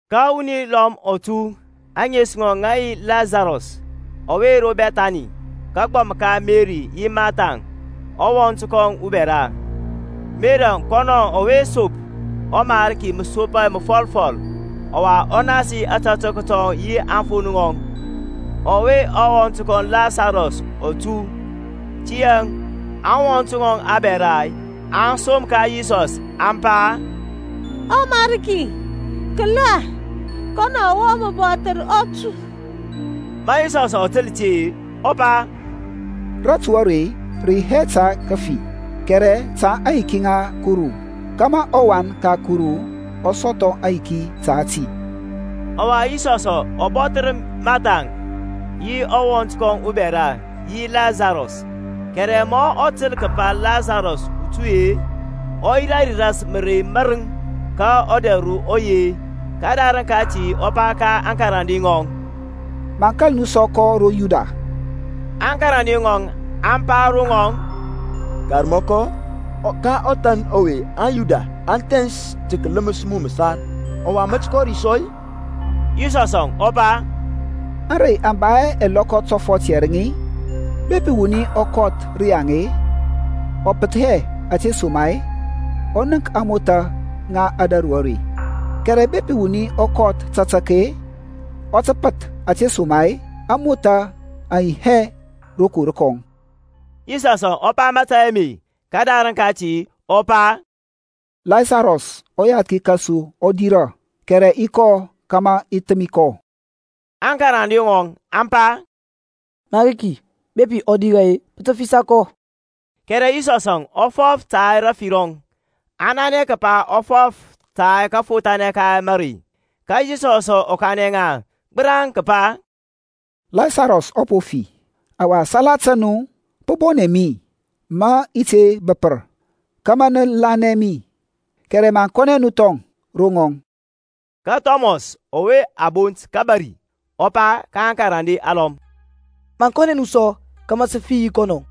Ka wuni lɔm ɔ tu, ȧŋes ŋɔŋ ŋə yi Lasarɔs, ɔwe ro Bɛthani, kagbɔm ka Meri yi Martha-əŋ ɔwɔnt kɔŋ ubɛra. Meri kɔnɔŋ, ɔwe sop ɔMarki masopa məfɔlfɔl ɔwa ɔ nasi ȧtȧtək tɔŋ yi aŋfon ŋɔŋ, ɔwe ɔwɔnt kɔŋ Lasarɔs ɔ tu. Tiyȧŋ aŋwɔnt ŋɔŋ abɛra aŋ som ka Yisɔs, aŋ pa, ƆMariki, kəla kɔn ɔwe mə bɔthər ɔ tu. Ma Yisɔsȧŋ ɔ təl ti-e, ɔ pa, Ratu are rə yi hɛ ta kəfi, kɛrɛ ta aŋyiki ŋa Kuru kȧmȧ ɔWan ka Kuru ɔ sɔthɔ ayiki ta ti. Ɔwa, Yisɔsȧŋ ɔ bɔthər Martha-əŋ, yi ɔwɔnt kɔŋ ubɛra, yi Lasarɔs. Kɛrɛ ma ɔ təl kəpa Lasarɔs ɔ tu-e, ɔ yirȧ ras mərey mȧrəŋ ka ɔdɛr ro ɔ yi. Kədarəŋ kati ɔ pa ka aŋkarande ŋɔŋ, Maŋ kȧl nu sɔ kɔ ro Yudia. Aŋkarande ŋɔŋ aŋ pa ro ŋɔŋ, Karmɔkɔ, ka ɔthan ɔwe aŋYuda aŋ thɛns tə kələməs mu məsar; ɔwa mə tə kɔ ri sɔ-i? Yisɔsȧŋ ɔ pa, Ȧŋrey aŋ ba hɛ ɛlɔkɔ tɔfɔt yɛrəŋ-i? Bepi wuni ɔ kɔth rəyaŋ-e, ɔ pəth hɛ, ȧtesoma-e ɔ nənk ȧŋmothȧ ŋa ȧdȧru are. Kɛrɛ bepi wuni ɔ kɔth tatak-e, ɔ tə pəth; ȧtesoma-e ȧŋmothȧ aŋ yi hɛ rokor kɔŋ. Yisɔsȧŋ ɔ pa mȧtȧy ame, kədarəŋ kati ɔ pa, Lasarɔs ɔyathki kȧsu ɔ dirȧ, kɛrɛ i kɔ kȧmȧ i thəmi kɔ. Aŋkarande ŋɔŋ aŋ pa, Mariki, bepi ɔ dirȧ-e, pə tə fisa kɔ. Kɛrɛ Yisɔsȧŋ ɔ fɔf ta rafi rɔŋ; aŋ nanɛ kəpa ɔ fɔf ta kafothanɛ ka mərey. Ka Yisɔsȧŋ ɔ kanɛ ŋa gbəraŋ kəpa, Lasarɔs ɔ po fi. Ɔwa salata nu pə bɔnɛ mi mə i te bəpər, kȧmȧ nə lanɛ mi; kɛrɛ maŋ kɔnɛ nu thɔŋ ro ŋɔŋ. Ka Thɔmɔs ɔwe a bont kȧbȧri, ɔ pa ka aŋkarande alɔm, Maŋ kɔnɛ nu sɔ, kȧmȧ sə fi yi kɔnɔ.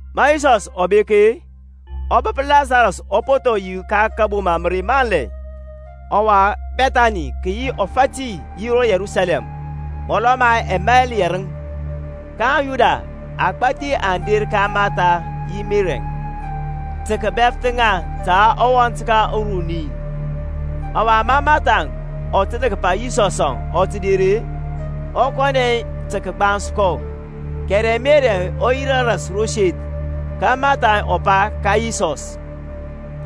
Ma Yisɔsȧŋ ɔ bek-e, ɔ bəp Lasarɔsȧŋ ɔ po thɔ yi ka kȧboma mərey manlɛ. Ɔwa Bɛthani kə yi ɔfati yi ro Yerusalɛm, mɔlɔ ma ɛmail yɛrəŋ: ka aŋYuda agbȧthi aŋ der ka Matha yi Merɛŋ, tə kəbɛfəth ŋa ta ɔwɔnt ka ŋaŋ uruni. Ɔwa ma Marthaŋ ɔ təl kəpa Yisɔsȧŋ ɔ tə der-e, ɔ kɔnɛ tə kəgbans kɔ: kɛrɛ Merɛŋ ɔ yirȧ ras ro seth. Ka Mathaŋ ɔ pa ka Yisɔs,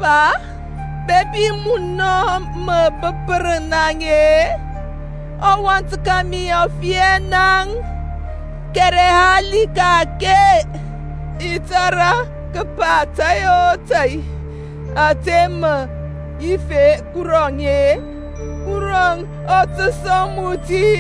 Pa bepi munɔ mə bəpər naŋ-e, ɔwɔnt mi ɔ fi hɛ naŋ. Kɛrɛ hali ka-ake, i tȧrȧ kəpa tȧy o tȧy ȧte mə yif Kuru-e, Kurɔŋ ɔ tə sɔŋ mu ti.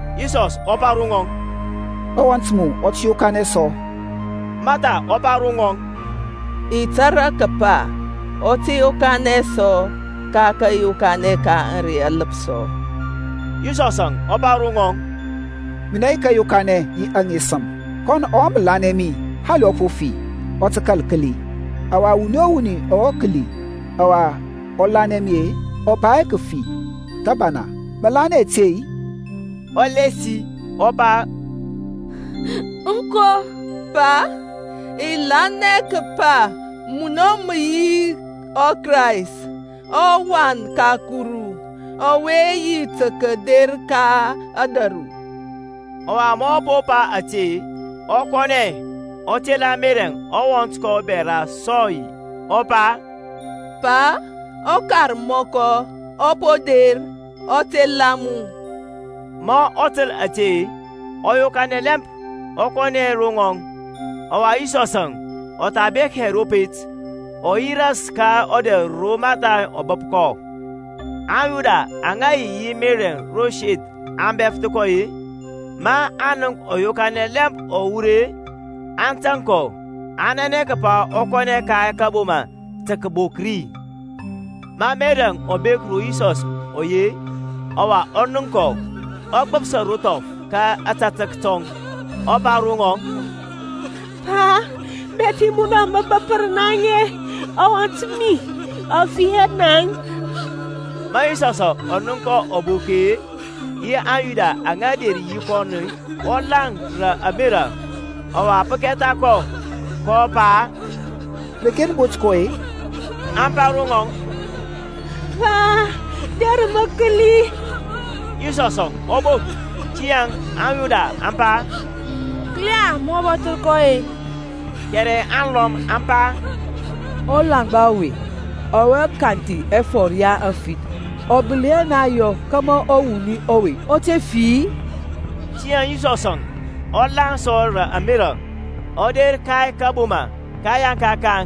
Yisɔs ɔ pa ro ŋɔŋ, Ɔwɔnt mu ɔ tə yokanɛ sɔ. Mathaŋ ɔ pa ro ŋɔŋ, I tȧrȧ kəpa ɔ tə yokanɛ sɔ ka kȧyokanɛ ka ȧŋrey aləpsɔ. Yisɔsȧŋ ɔ pa ro ŋɔŋ, Minɛ yi kȧyokanɛ, yi aŋesəm: kɔn ɔwe mə lanɛ mi, hali ɔ po fi, ɔ tə kȧl kəli: ɔwa wuni o wuni ɔwe kəli ɔwa ɔ lanɛ mi-e, ɔ ba hɛ kəfi thəbana. Mə lanɛ ȧte-i? Ɔ lasi ɔ pa, Aŋko, Pa; i lanɛ kəpa munɔ mə yi ɔKrayst, ɔWan ka Kuru, ɔwe yi tə kəder ka ȧdȧru. Ɔwa ma ɔ po pa ȧte, ɔ kɔnɛ, ɔ tela Merɛŋ ɔwɔnt kɔŋ ubɛra sɔy, ɔ pa, ƆKarmɔkɔ ɔ po der, ɔ tela mu. Ma ɔ təl ȧte, ɔ yokanɛ lɛmp, ɔ kɔnɛ ro ŋɔŋ. Ɔwa Yisɔsȧŋ ɔ tha bek hɛ ro pet, ɔ yi ras ka ɔdɛr ro Mathaŋ ɔ bəp kɔ. AŋYuda aŋa yi yi Merɛŋ ro seth aŋa bɛfəth kɔ-e, maŋ nənk ɔ yokanɛ lɛmp ɔ wur-e, aŋ tȧŋ kɔ, aŋ nanɛ kəpa ɔ kɔnɛ ka kȧboma tə kəbok ri. Ma Merɛŋ ɔ bek ro Yisɔs ɔ yi-e, ɔwa ɔ nənk kɔ, ɔ gbəpsa ro thɔf ka ȧtȧtək tɔŋ, ɔ pa ro ŋɔŋ, Pa, bepi munɔ mə bəpər naŋ-e, ɔwɔnt mi ɔ fi hɛ naŋ. Ma Yisɔsȧŋ ɔ nənk kɔ ɔ bok-e, yi aŋYuda aŋa der yi kɔnɔ, ɔ laŋ rə ȧmerȧ, ɔwa pə kɛtha kɔ, kɔ pa, Reke nə bot kɔ-e? Aŋ pa ro ŋɔŋ, Pa, der mə kəli. Yisɔsȧŋ ɔ bok. Tiyȧŋ aŋYuda aŋ pa, Kəla ma ɔ bɔthər kɔ! Kɛrɛ alɔm aŋ pa, Ɔlaŋgba ɔwe, ɔwe kanthi ɛfɔr ya aŋfith, ɔ gbəli hɛ naŋ yɔ kȧmȧ ɔwuni ɔwe ɔ te fi-i? Tiyȧŋ Yisɔsȧŋ ɔ laŋ sɔ rə ȧmerȧ, ɔ der ka kȧboma. Kəyaŋka kaŋ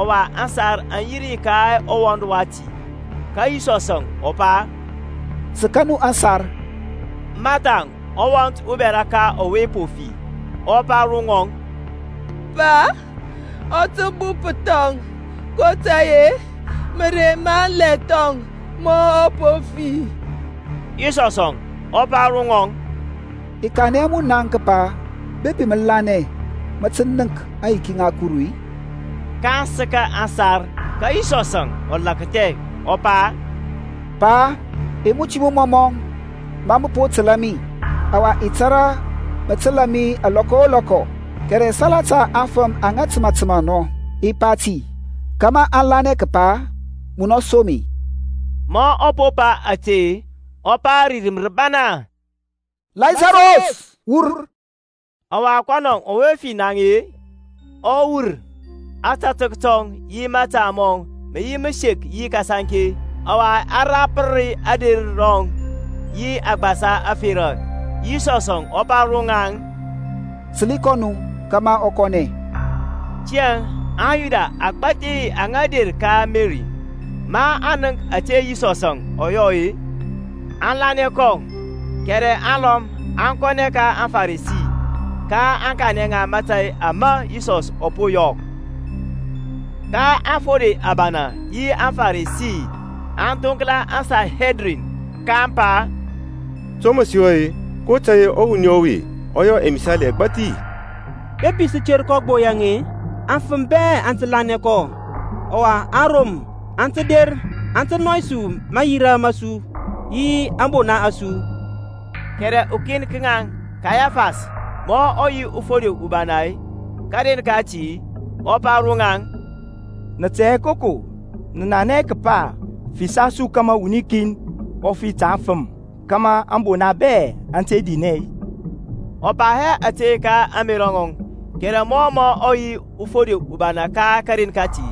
ɔwa ȧsar aŋ yi ka ɔwɔnd wati. Ka Yisɔsȧŋ ɔ pa, Səka nu aŋsar. Mathaŋ, ɔwɔnt ubɛra ka ɔwe po fi, ɔ pa ro ŋɔŋ, Pa ɔ tə bup thɔŋ: kotȧy-e mərey manlɛ thɔŋ ma ɔ po fi. Yisɔsȧŋ ɔ pa ro ŋɔŋ, I kanɛ hɛ mu naŋ kəpa, bepi mə lanɛ mə tə nənk aŋyiki ŋa Kuru-i? kaŋ səka aŋsar. Ka Yisɔsȧŋ ɔ lakthɛ, ɔ pa, Pa i muti mu mɔmɔ ma mə po təlȧ mi. Ɔwa i tȧrȧ mə təlȧ mi lɔkɔ o lɔkɔ: kɛrɛ salata aŋfəm aŋa təmȧ təmȧ nɔ i pa ti, kȧmȧ aŋ lanɛ kəpa munɔ som mi. Ma ɔ po pa ȧte, ɔ pa rə rim rəbana, Lasarɔs, wur! Ɔwa kɔnɔ ɔwe fi naŋ-e, ɔ wur, ȧtȧtək tɔŋ yi mȧta mɔŋ mə yi məsek yi kasaŋke, ɔwa a rapər ader rɔŋ yi agbasa ȧferȧ. Yisɔsȧŋ ɔ pa ro ŋaŋ, Səli kɔ nu, kȧmȧ ɔ kɔnɛ. Tiyȧŋ aŋYuda agbȧthi aŋa der ka Meri, maŋ nənk ȧte Yisɔsȧŋ ɔ yɔ-e, aŋ lanɛ kɔ. Kɛrɛ alɔm aŋ kɔnɛ ka aŋFarisi, kaŋ kanɛ ŋa mȧtȧy ama Yisɔsȧŋ ɔ po yɔ. Ka aŋfode abana yi aŋFarisi aŋ thoŋkla aŋSanhedrin, kaŋ pa, To mə sə yɔ-e? kotȧy-e ɔwuni ɔwe ɔ yɔ ɛmisali ɛgbathi, bepi sə ter kɔ gbo yaŋ-e, afəm bɛ aŋ tə lanɛ kɔ: ɔwa aŋRom aŋ tə der aŋ tə nɔy mayira ma su yi ȧŋbona a su. Kɛrɛ ukin ka ŋaŋ, Kayafas, mɔ ɔ yi ɔfode ubana karen kati, ɔ pa ro ŋaŋ, Nə tɛ hɛ koko, nə nanɛ hɛ kəpa pə fisa su kȧmȧ wuni kin ɔ fi ta aŋfəm, kȧmȧ ȧŋbona bɛ aŋ te dinɛ-i? Ɔ pa hɛ ȧte ka ȧŋmerȧ ŋɔŋ: kɛrɛ mɔ ɔ yi ɔfode ubana ka karen kati,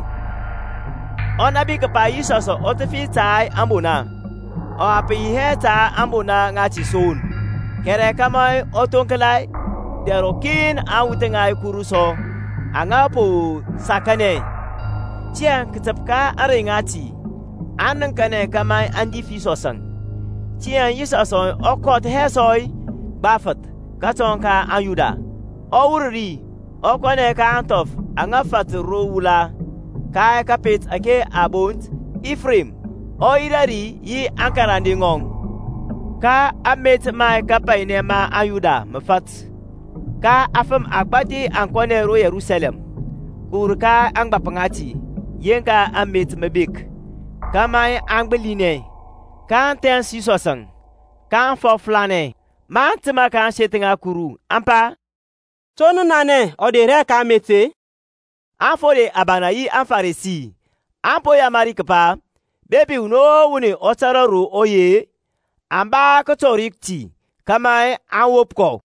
ɔ nȧbi kəpa Yisɔsȧŋ ɔ tə fi ta ȧŋbona; ɔwa pə yi hɛ ta ȧŋbona ŋati son, kɛrɛ kȧmȧ ɔ thoŋkla dɛr ɔkin aŋwuth ŋa Kuru sɔ aŋa po sakanɛ. Tiyȧŋ kətəp ka ȧŋrey ŋati aŋ nəŋkanɛ kȧmȧ aŋ dif Yisɔsȧŋ. Tiyȧŋ Yisɔsȧŋ ɔ kɔth hɛ sɔ gbafəth kətɔŋ ka aŋYuda; ɔ wur ri ɔ kɔnɛ ka ȧŋthɔf aŋa fatər ro wula, ka kȧpet ȧke a bont Ifrem, ɔ yirȧ ri yi aŋkarande ŋɔŋ. Ka amet ma kapainɛ ma aŋYuda mə fat: ka afəm agbȧthi aŋ kɔnɛ ro Yerusalɛm, kəwur ka ȧŋgbȧp ŋati yeŋka amet mə bek, kȧmȧ aŋ gbilinɛ. kaŋ thɛns Yisɔsȧŋ, kaŋ fɔflanɛ maŋ təmȧ ka ȧŋseth ŋa Kuru, aŋ pa, To nə nanɛ ɔ der hɛ ka amet-e? Aŋfode abana yi aŋFarisi aŋ po yamari kəpa, bepi wuni o wuni ɔ tȧrȧ ro ɔ yi-e, ɔ ba kətɔri ti, kȧmȧ aŋ wop kɔ.